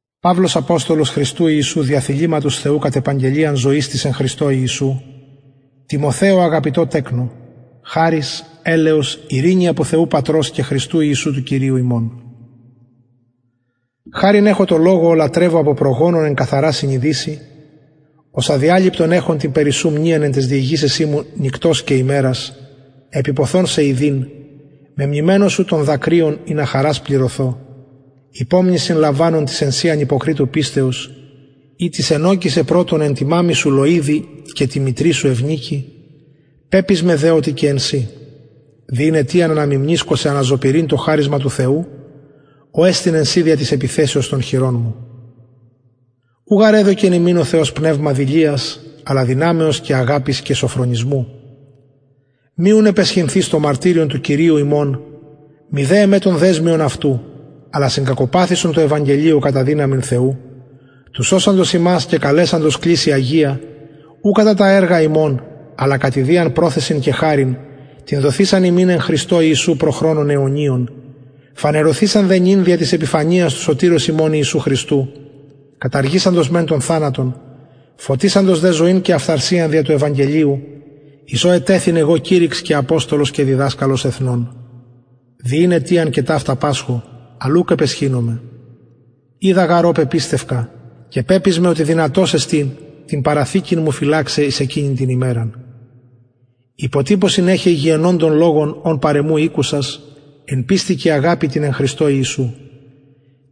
παυλος αποστολος ιησου χριστου δια θεληματος θεου κατ επαγγελιαν ζωης της εν χριστω ιησου τιμοθεω αγαπητω τεκνω χαρις ελεος ειρηνη απο θεου πατρος και χριστου ιησου του κυριου ημων χαριν εχω τω θεω ω λατρευω απο προγονων εν καθαρα συνειδησει ως αδιαλειπτον εχω την περι σου μνειαν εν ταις δεησεσιν μου νυκτος και ημερας επιποθων σε ιδειν μεμνημενος σου των δακρυων ινα χαρας πληρωθω υπομνησιν λαμβανων της εν σοι ανυποκριτου πιστεως ητις ενωκησεν πρωτον εν τη μαμμη σου λωιδι και τη μητρι σου ευνικη πεπεισμαι δε οτι και εν σοι δι ην αιτιαν αναμιμνησκω σε αναζωπυρειν το χαρισμα του θεου ο εστιν εν σοι δια της επιθεσεως των χειρων μου ου γαρ εδωκεν ημιν ο θεος πνευμα δειλιας αλλα δυναμεως και αγαπης και σωφρονισμου μη ουν επαισχυνθης το μαρτυριον του κυριου ημων μηδε εμε τον δεσμιον αυτου αλλα συγκακοπαθησον τω ευαγγελιω κατα δυναμιν θεου του σωσαντος ημας και καλεσαντος κλησει αγια ου κατα τα εργα ημων αλλα κατ ιδιαν προθεσιν και χαριν την δοθεισαν ημιν εν χριστω ιησου προ χρονων αιωνιων φανερωθεισαν δε νυν δια της επιφανειας του σωτηρος ημων ιησου χριστου καταργησαντος μεν τον θανατον φωτισαντος δε ζωην και αφθαρσιαν δια του ευαγγελιου εις ο ετεθην εγω κηρυξ και αποστολος και διδασκαλος εθνων δι ην αιτιαν και ταυτα πασχω αλλ ουκ επαισχυνομαι οιδα γαρ ω πεπιστευκα και πεπεισμαι οτι δυνατος εστιν την παραθηκην μου φυλαξαι εις εκεινην την ημεραν υποτυπωσιν εχε υγιαινοντων λογων ων παρ εμου ηκουσας εν πιστει και αγαπη τη εν χριστω ιησου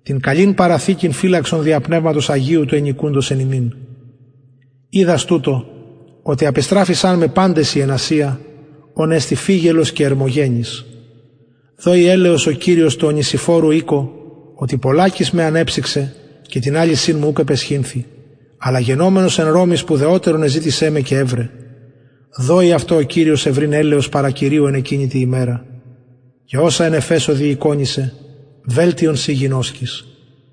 την καλην παραθηκην φυλαξον δια πνευματος αγιου του ενοικουντος εν ημιν οιδας τουτο οτι απεστραφησαν με παντες οι εν τη ασια ων εστιν φυγελος και ερμογενης δωη ελεος ο κυριος τω ονησιφορου οικω οτι πολλακις με ανεψυξεν και την αλυσιν μου ουκ επαισχυνθη αλλα γενομενος εν ρωμη σπουδαιοτερον εζητησεν με και ευρεν δωη αυτω ο κυριος ευρειν ελεος παρα κυριου εν εκεινη τη ημερα και οσα εν εφεσω διηκονησεν βελτιον συ γινωσκεις